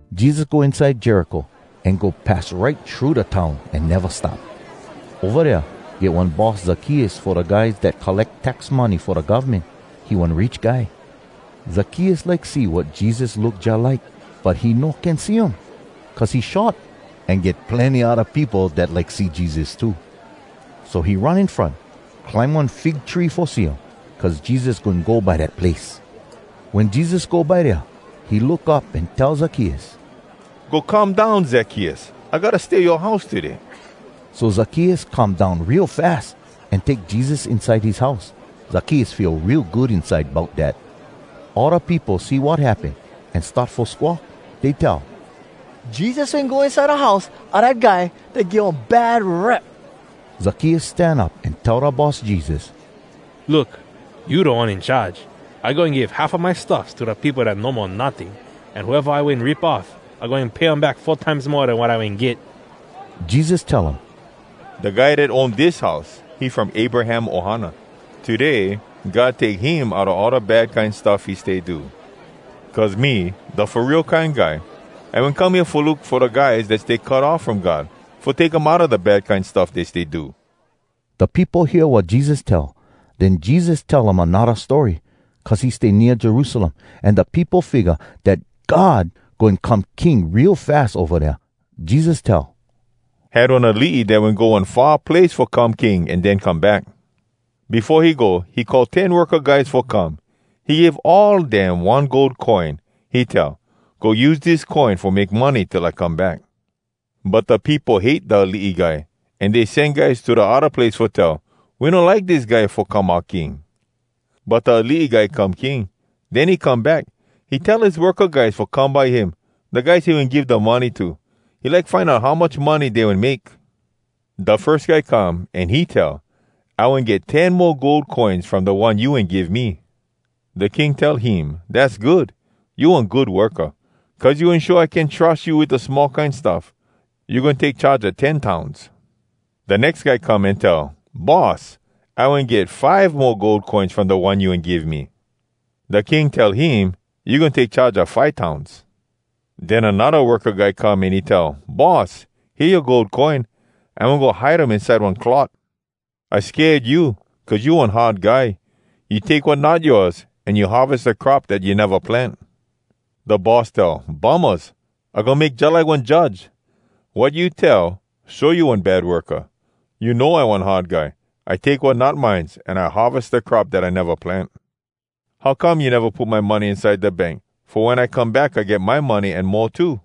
Jesus go inside Jericho an go pass right thru da town an neva stop. Ova dea get one boss Zakkeus fo da guys dat colleck tax money fo da govmen. He one rich guy. Zakkeus like see wat Jesus look jalike, but he no can see um, cuz he short, an get plenny odda peopo dat like see Jesus too. So he run in front, climb one fig tree fo see um, cuz Jesus goin go by dat place. Wen Jesus go by dea, he look up an tell Zakkeus, “Go come down, Zakkeus. I gotta stay yoa house today.” So Zakkeus come down real fas, an take Jesus inside his house. Zakkeus feel real good inside bout dat. All da peopo see wat happen, an start fo squawk. Dey tell, “Jesus wen go inside da house a dat guy dat get one bad rep!” Zakkeus stan up an tell da Boss Jesus, “Look, you Da One In Charge! I goin give half a my stuffs to da peopo dat no mo notting, an whoeva I wen rip off, I goin pay um back four times mo den wat I wen get.” Jesus tell um, “Da guy dat own dis house, he from Abraham ohana. Today God take him outa all da bad kine stuff he stay do. Cuz me, da Fo Real Kine Guy, I wen come hea fo look fo da guys dat stay cut off from God, fo take um outa da bad kine stuff dey stay do.” Da peopo hear wat Jesus tell. Den Jesus tell um anodda story, cuz he stay nea Jerusalem, an da peopo figga dat God goin come king real fas ova dea. Jesus tell, “Had one alii dat wen go one far place fo come king an den come back. Befo he go, he call ten worka guys fo come. He give all dem one gold coin. He tell, ‘Go use dis coin fo make money till I come back.’ But da peopo hate da alii guy, an dey sen guys to da odda place fo tell, ‘We no like dis guy fo come oua king.’ “But da alii guy come king. Den he come back. He tell his worka guys fo come by him, da guys he wen give da money to. He like find out how much money dey wen make. Da firs guy come an he tell, ‘I wen get ten mo gold coins from da one you wen give me.’ Da king tell him, ‘Dass good! You one good worka. Cuz you wen show I can trus you wit da small kine stuff, you goin take charge a ten towns.’ Da nex guy come an he tell, ‘Boss, I wen get five mo gold coins from da one you wen give me.’ Da king tell him, ‘You goin take charge a five towns.’ Den anodda worka guy come an he tell, ‘Boss, hea yoa gold coin. I wen go hide um inside one cloth. I sked you, cuz you one hard guy. You take wat not yoas, an you harves da crop dat you neva plant.’ Da boss tell, ‘Bummahs! I goin make jalike one judge. Wat you tell show you one bad worka! You know I one hard guy. I take wat not mines, an I harves da crop dat I neva plant. How come you neva put my money inside da bank, fo wen I come back I get my money an mo too?’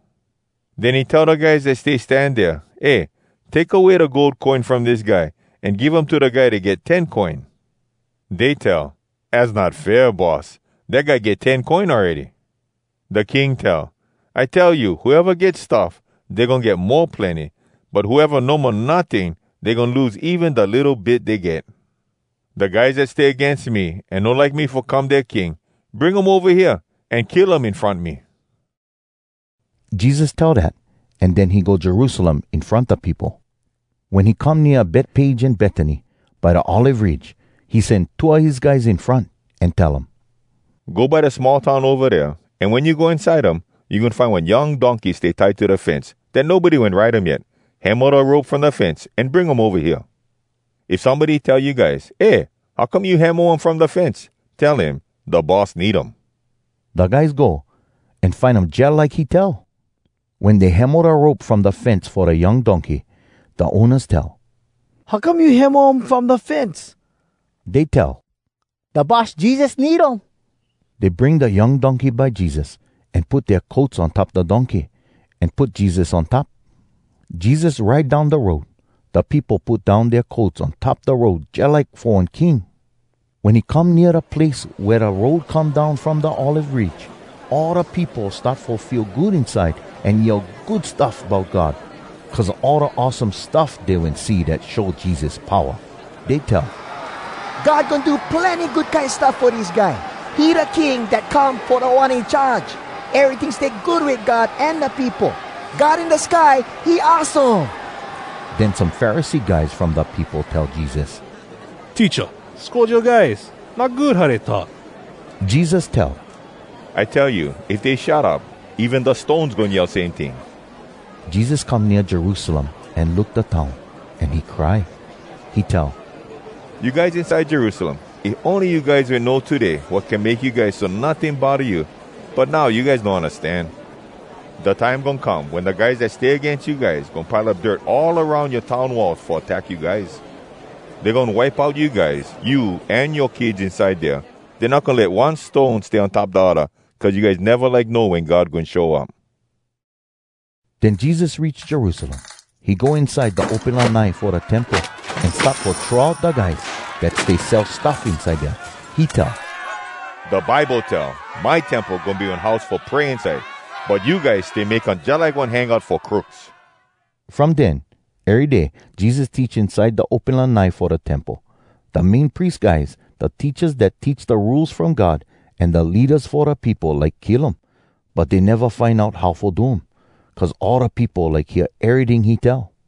Den he tell da guys dat stay stan dea, ‘Eh, take away da gold coin from dis guy an give um to da guy dat get ten coin.’ Dey tell, ‘Az not fair, Boss! Dat guy get ten coin awready!’ Da king tell, ‘I tell you, whoeva get stuff, dey goin get mo plenny, but whoeva no mo notting, dey goin lose even da litto bit dey get. Da guys dat stay agains me an no like me fo come dea king—bring um ova hea, an kill um in front me.’” Jesus tell dat, an den he go Jerusalem in front da peopo. Wen he come nea Betpage an Betany, by da Olive Ridge, he sen two a his guys in front, an tell um, “Go by da small town ova dea, an wen you go inside um, you goin find one young donkey stay tie to da fence, dat nobody wen ride um yet. Hemo da rope from da fence an bring um ova hea. If somebody tell you guys, ‘Eh, how come you hemo um from da fence?’ tell him, ‘Da Boss need um.’” Da guys go, an find um jalike he tell. Wen dey hemo da rope from da fence fo da young donkey, da ownas tell, “How come you hemo um from da fence?” Dey tell, “Da Boss Jesus need um.” Dey bring da young donkey by Jesus, an put dea coats on top da donkey, an put Jesus on top. Jesus ride down da road. Da peopo put down dea coats on top da road jalike fo one king. Wen he come nea da place wea da road come down from da Olive Ridge, all da peopo start fo feel good inside an yell good stuff bout God, cuz a all da awesome stuff dey wen see dat show Jesus powa. Dey tell, “God goin do plenny good kine stuff fo dis guy! He da King dat come fo Da One In Charge! Eryting stay good wit God an da peopo. God in da sky, he awesome!” Den some Pharisee guys from da peopo tell Jesus, “Teacha, scold yoa guys! Not good, how dey talk!” Jesus tell, “I tell you, if dey shut up, even da stones goin yell same ting.” Jesus come nea Jerusalem an look da town, an he cry. He tell, “You guys inside Jerusalem, if ony you guys wen know today wat can make you guys so notting bodda you—but now you guys no undastan. Da time goin come wen da guys dat stay agains you guys goin pile up dirt all aroun yoa town wall fo attack you guys. Dey goin wipe out you guys, you an yoa kids inside dea. Dey not goin let one stone stay on top da odda. Cuz you guys neva like know wen God goin show up.” Den Jesus reach Jerusalem. He go inside da open lanai fo da Temple, an start fo throw out da guys dat stay sell stuff inside dea. He tell, “Da Bible tell, ‘My Temple goin be one house fo pray inside.’ But you guys stay make um jalike one hangout fo crooks!” From den, ery day Jesus teach inside da open lanai fo da Temple. Da Main Pries guys, da teachas dat teach da Rules From God, an da leadas fo da peopo like kill um, but dey neva find out how fo do um, cuz all da peopo like hear eryting he tell.